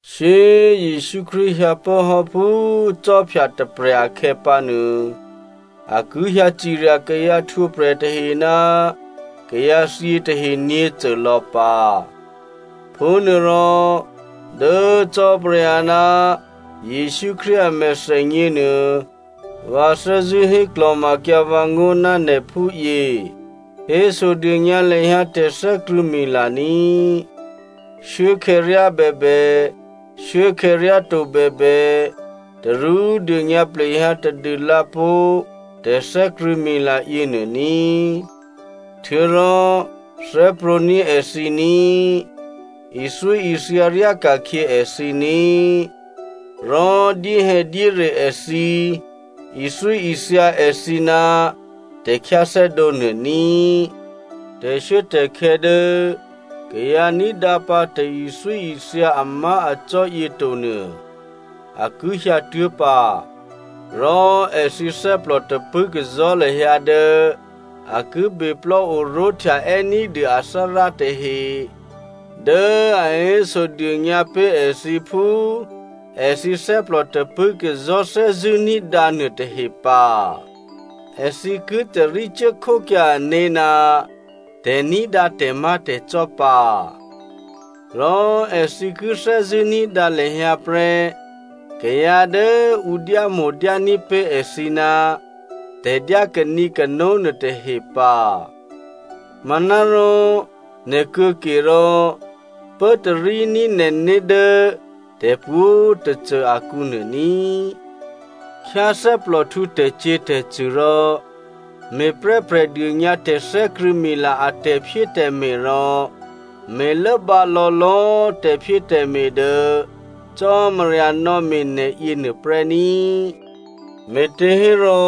Shyé꤮ Jesǔ Krístu hyǎpốhò́ phú khwí tôprè̤ akhè̌pǎnuô, a ki hyǎ cirya kayǎ htwǒprè̤ tahe ná kayǎthyě tahe nyě̤côlò̌ pǎ. Phúnuôrò dố Cò́marya ná Jesǔ Krístu a mèthènyě nuô vǎ thè́zṳ̂́ héklò̤makyǎ vǎngó̤ ná nè̤ phúyě, hésodônyǎ lahyǎ tè̤thè́krṳ̂̌mila ní꤮. Shuốkhè̌ ryá bèbè, shuốkhè̌ ryáto bèbè, tarú dônyǎ plehyǎ tadû lǎpó̤ tè̤thè́krṳ̂̌mila yěnuô ní꤮, htuô̌rò thè́prwǒ̤ní̤ èthǐ ní꤮, ithyóithya ryáka̤khyě èthǐ ní꤮, rò dyéhè̌dyére èthǐ, ithyóithya èthǐ ná tè̤khyáthè́dǒ nuô ní꤮. Tè̤shuốtè̤khè̌ dố kayǎ ní̤dǎpǎ tè̤ithyóithya amá̤acò́ yětonuô a ki hyǎtuố̤ pǎ. Rò èthǐ thè́plò tapṳ̂́kazò̤́ lahyǎ dố a ki beplò́ oró̤htyaè́ ní̤dû athárá tahe dố a hésodônyǎ pé̤ èthǐ phú èthǐ thè́plò tapṳ̂́kazò̤́ thè́zṳ̂́ ní̤dǎnuô tahe pǎ. Èthǐ ki tarí cuốkhókyǎ ané̤ ná tè̤ní̤dǎ tè̤má̤tè̤cò́ pǎ, rò èthǐ ki thè́zṳ̂́ ní̤dǎ lahyǎ prè́ kayǎ dố ǔ dyámo̤dyání̤ pé̤ èthǐ ná tè̤dyá kanǐkano nuôtahe pǎ. Manárò nè̤ kuô̌kerò, pốtaríní̤ nè̤né̤ dố tè̤pwǒ̤꤮ tôcô akǔnuô ní꤮, khyáthè́plòhtǔ tè̤cyě̤tè̤cṳ̂ rò me̤prè́ prè̤dônyǎ tè̤thè́krṳ̂̌mila a tè̤phyétè̤me̤ rò me̤lốbǎ lò̌lò̌꤮ tè̤phyétè̤me̤ dố Cò́marya nò̌me̤ nè̤ yěnuô prè́ ní꤮. Me̤těhérò,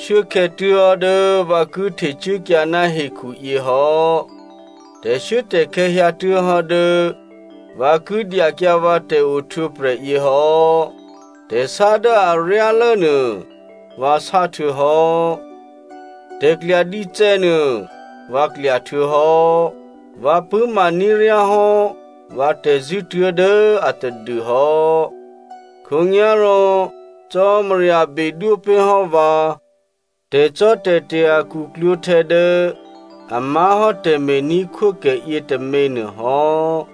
shuốkhè̌ tuố̤hò́ dố vǎ ki htecuốkyǎ ná hekhuyě hò́. Tè̤shuốtè̤khè̌ hyǎtuố̤hò́ dố vǎ ki dyakyǎ vǎ tè̤ohtwǒprè̤ yěhò́. Tè̤sá dố aryálố nuô vǎ sáhtuô̌hò́. Tè̤klya dícè̌ nuô vǎ klya htuô̌hò́. Vǎ pṳ̂́ma ní̤ ryá hò́ vǎ tè̤zṳ̂́ tuố̤dố atadûhò́. Khǒnyá̤rò Cò́marya bedwó pé̤hò́ vǎ tè̤cò́tè̤te̤ a khuklwǒ̤htè̌ dố a má̤hò́ tè̤me̤ní̤khwókè yětômě nuôhò́.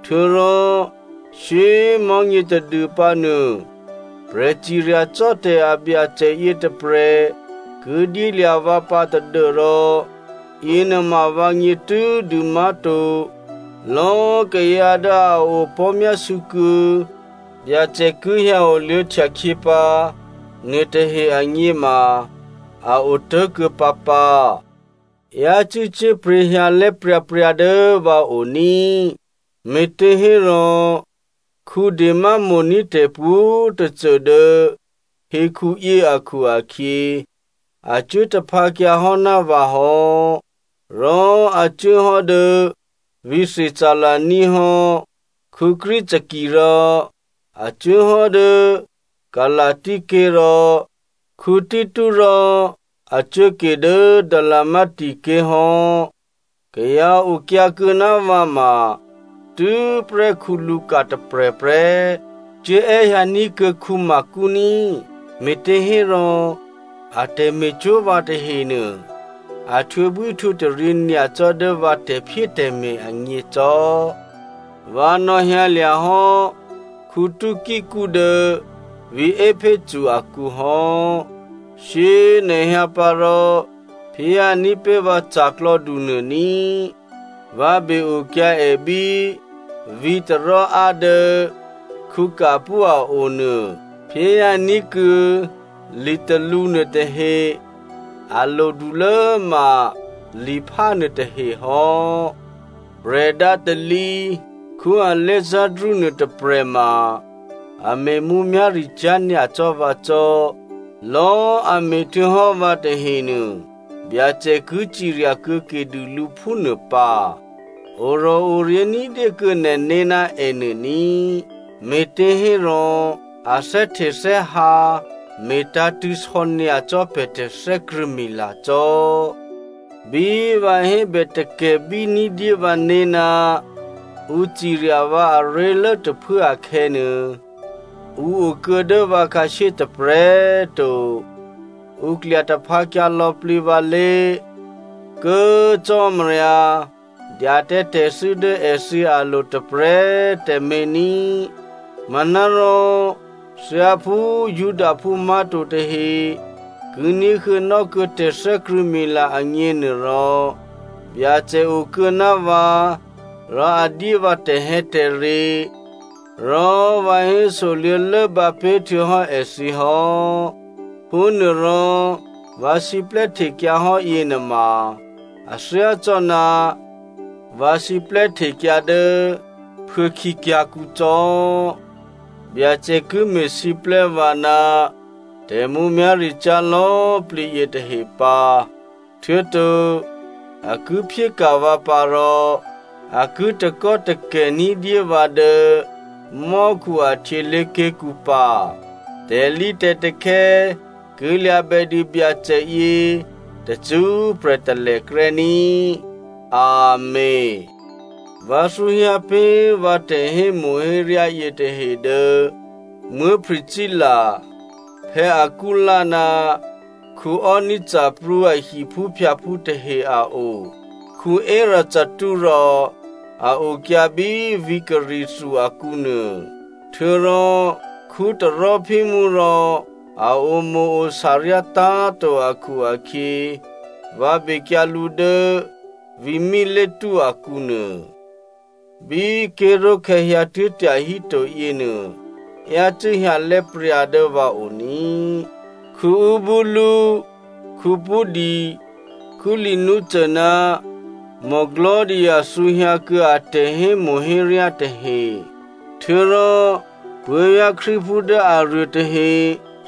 Htuô̌rò shyé꤮ mò̤́nyě tadû pǎnuô, prè̤ciryacò́tè̤ a Byacè yětôprè̤ ki dyélya̤ vǎ pǎ tadû́rò yěnuôma vǎgně tû́dû má̤to. Lò̌꤮ kayǎ dố a opò̤́myásû̌kuô̌ Byacè ki hyǎ oluô̌htya khyě pǎ nuôtahe agněma a otố̤kuô̌ pǎpǎ. Yácû́ cyé̤pryě̤ hyǎlè́ pryǎpryǎ dố vǎ o ní꤮. Me̤těhérò, Dema mo̤ní̤ tè̤ pwǒ̤꤮ tôcô dố hekhuyě akhu-akhyě, a cuố taphǎkyǎ hò́ ná vǎ hò́, rò a cuốhò́ dố vǐ̤ Thessalonia hò́. Crescen rò a cuốhò́ dố Galasia ké̤ rò Tito rò a cuốke dố Dalmatia ké̤ hò́. Kayǎ okyǎkuô̌ ná vǎ ma tû́prè́ Luka tôprè̤prè́. Cuố è́hyǎ ní̤kuô̌ Marko ní꤮. Me̤těhérò a tè̤me̤cwó̤ vǎ tahenuô, a htwǒbwíhtwǒtaryě nyacò́ dố vǎ tè̤phyétè̤me̤ agně cò́. Vǎ nò̌hyǎlya̤ hò́ Tykico dố vǐ̤ Epheso akǔ hò́. Shyé꤮ nè̤ hyǎ pǎ rò phyéhyǎní̤ pé̤ vǎ ca̤klò̌du nuô ní꤮. Vǎ be-okyǎ è bí vǐ̤ Troa dố Carpo a o nuô. Phyéhyǎ ní̤kuô̌ litalǔ nuôtahe. A lodulố ma liphá nuôtahe hò́. Prè̤dǎ talǐ Alexandro nuôtôprè̤ ma, a me̤ mǔmyá̤ricyá̤ nyacò́ vǎ cò́. Lò̌꤮ a me̤htuô̌hò́ vǎ tahenuô Byacè ki cirya kuô̌ke dû lǔ phúnuô pǎ. Orò̤oryě̤ ní̤dyé kuô̌ nè̤né̤ ná ènuô ní꤮, me̤těhérò a thè́htethè́hǎ me̤tǎ̤tṳ̂̌ sò̌nyacò́ pè̤ tè̤thè́krṳ̂̌mila cò́. Bí vǎ hébè takè̤ bíní̤dyé vǎné̤ ná ǔ cirya vǎ aré̤lố tôphuố akhè̌nuô, ǔ okuô̌ dố vǎ khǎshyé tôprè̤꤮ to. Ǔ klya taphǎkyǎ lò̌plǐ vǎlé̤. Kố꤮ Cò́marya, dya tǎ tè̤thû́ dố èthǐ alo̤ tôprè̤꤮ tǎmé̤ ní꤮. Manárò thyáphú Judaphú má̤to tahe ki ní̤huô̌nò́ kuô̌ tè̤thè́krṳ̂̌mila agněnuôrò, Byacè okuô̌ ná vǎ rò a dyé vǎ tè̤hè̌tè̤re rò vǎ hésoluô̌ lốbǎ pé̤htuô̌hò́ èthǐ hò́. Phúnuôrò vǎ siplè́ htekyǎhò́ yěnuôma a thyácò́ná vǎ siplè́ htekyǎ dố phuô̌khǐ kyǎ̤kǔ cò́. Byacè ki me̤siplè́ vǎ ná tè̤mǔmyá̤ricyá̤ lò̌plǐ yětahe pǎ, htuô̌to a ki phyéka̤ vǎ pǎ rò a ki takò́takè̤ ní̤dyé vǎ dố mò́khu a htyělé̤ké̤kǔ pǎ. Tè̤lǐtè̤takhè̌ ki lya̤bè dû Byacè yě tacṳ́prè̤ talèkrè́ ní꤮. Amèn. Vǎ thǔhyǎ pé̤ vǎ tè̤hémo̤héryá yětahe dố Priscilla, Aquila ná Onesiphoro a hiphúphyǎphú tahe a o. Erasto rò a okyǎ bí vǐ̤ Corinthia akǔnuô. Htuô̌rò Trophimo rò a omo̤-ori̤ ryátá̤to akhu-akhyě, vǎ bekyǎ lǔ dố vǐ̤ Mileto akǔnuô. Bí꤮ ké̤ró̤khè̌ hyǎtuố̤ tyahíto yěnuô, yácû́ hyǎlè́ pryǎ dố vǎ o ní꤮, Eubulo, Pudens, Lino ná Claudia thǔhyǎ kuô̌ a tè̤hémo̤héryá tahe. Htuô̌rò puố̤vyá̤ Krístuphú dố aruô tahe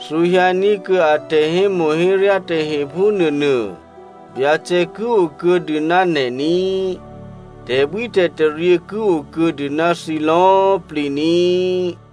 thǔhyǎ ní̤kuô̌ a tè̤hémo̤héryá tahe phúnuônuô. Byacè ki okuô̌dû ná nè̤ ní꤮. Tè̤bwítè̤taryě ki okuô̌dû ná thǐ lò̌꤮ plǐ ní꤮.